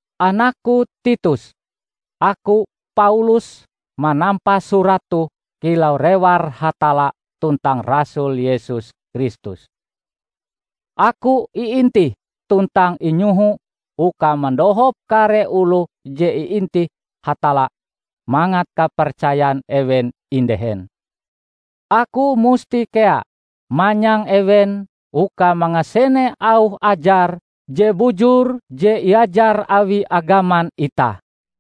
Anakku Titus! Aku, Paulus manampa surat toh kilau rewar Hatalla tuntang rasul Yesus Kristus. Aku iintih tuntang inyoho uka mandohop kare oloh je iintih Hatalla mangat kapercayan ewen indehen. Aku musti kea manyang ewen uka mangasene auh ajar je bujur je iajar awi agaman itah.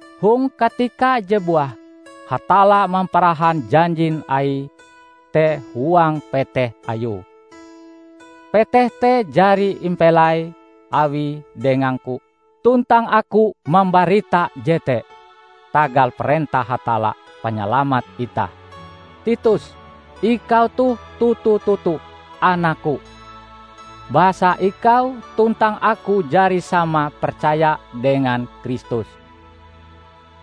Hong katika je buah, Hatalla mamparahan janjin Aie te huang peteh Ayue. Peteh te jari impelai Awie dengangku tuntang aku mambarita jete tagal parentah Hatalla Panyalamat itah. Titus, ikau toh toto-toto anakku, basa ikau tuntang aku jari sama percaya dengan Kristus.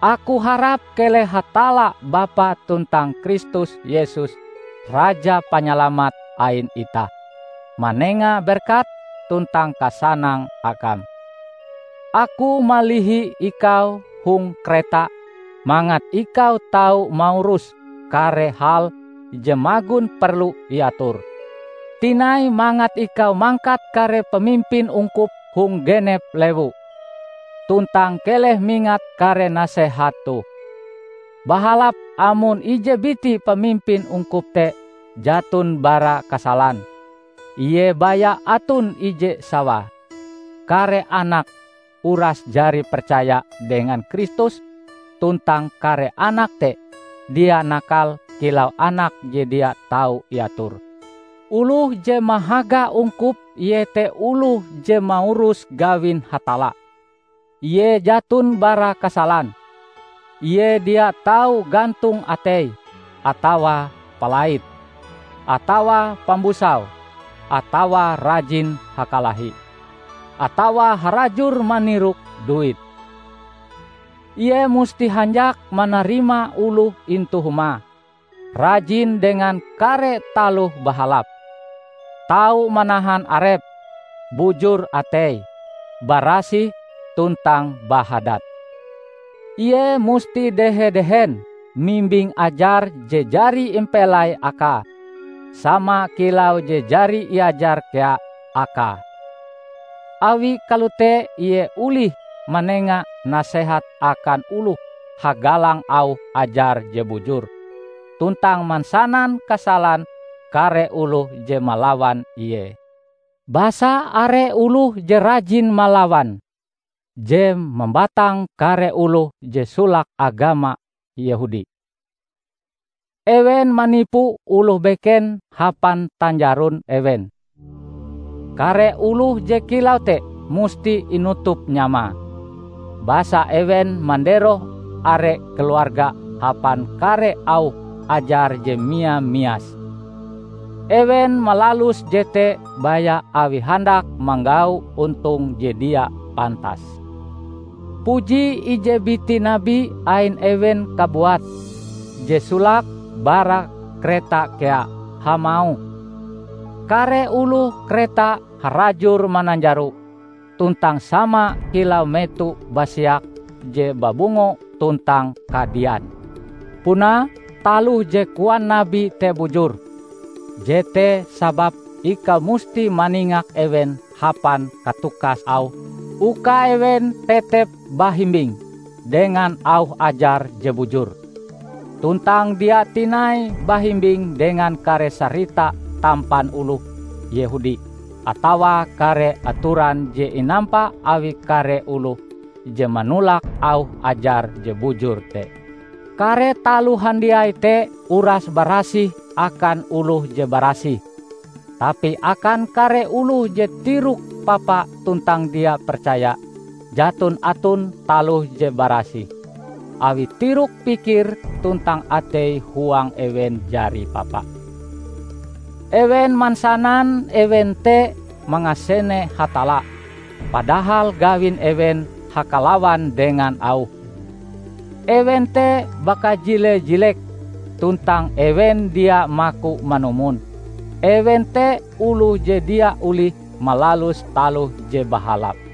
Aku harap keleh Hatalla Bapa tuntang Kristus Yesus Raja Panyalamat ain itah, manenga berkat tuntang kasanang akam. Aku malihi ikau hong Kreta mangat ikau tau maurus kare hal je magon perlu iator. Tinai, mangat ikau mangkat kare pamimpin ungkup hong genep lewu. Tuntang keleh mingat kare nasehat toh: Bahalap amon ije biti pamimpin ungkup te jaton bara kasalan; ie baya aton ije sawae; kare anake uras jari percaya dengan Kristus tuntang kare anak te dia nakal kilau anak je dia tau iator. Oloh je mahaga ungkup iete oloh je maurus gawin Hatalla, ie jaton bara kasalan. Ie dia tau gantong ateie atawa palait, atawa pambusau, atawa rajin hakalahi, atawa harajur manirok duit. Ie musti hanjak manarima oloh intu humae, rajin dengan kare taloh bahalap, tau manahan arepe, bujur ateie, barasih tuntang bahadat. Ie musti dehe-dehen mimbing ajar je jari impelai akae, sama kilau je jari iajar kea akae. Awi kalote ie olih manenga nasehat akan oloh hagalang auh ajar je bujur, tuntang mansanan kasalan kare oloh je malawan ie. Basa are oloh je rajin malawan, je mambatang kare oloh je solake agama Yehudi, ewen manipu oloh beken hapan tanjaron ewen. Kare oloh je kilau te musti inutup nyamae; basa ewen manderoh are keluarga hapan kare auh ajar je mia-mias. Ewen malalus jete baya awi handak manggau ontong je dia pantas! Puji ije biti nabi ain ewen kabuat, je solake bara Kreta kea, hamauh, "Kare oloh Kreta harajur mananjaro, tuntang sama kilau meto basiak je babungo tuntang kadian." Punae, taloh je koan nabi te bujur. Jete sababe ikau musti maningak ewen hapan katukas auhm uka ewen tetep bahimbing dengan auh ajar je bujur tuntang dia tinai bahimbing dengan kare sarita tampan oloh Yehudi atawa kare atoran je inampa awi kare oloh je manolak auh ajar je bujur te. Kare taloh handiai te uras barasih akan oloh je barasih. Tapi akan kare oloh je tiroke papa tuntang dia percaya, jaton aton taloh je barasih, awi tirok-pikir tuntang atei-huang ewen jari papa! Ewen mansanan ewen te mangasene Hatalla, padahal gawin ewen hakalawan dengan Auhe. Ewen te bakajile-jilek, tuntang ewen dia maku manumon: ewen te oloh je dia olihe malalus taloh je bahalap.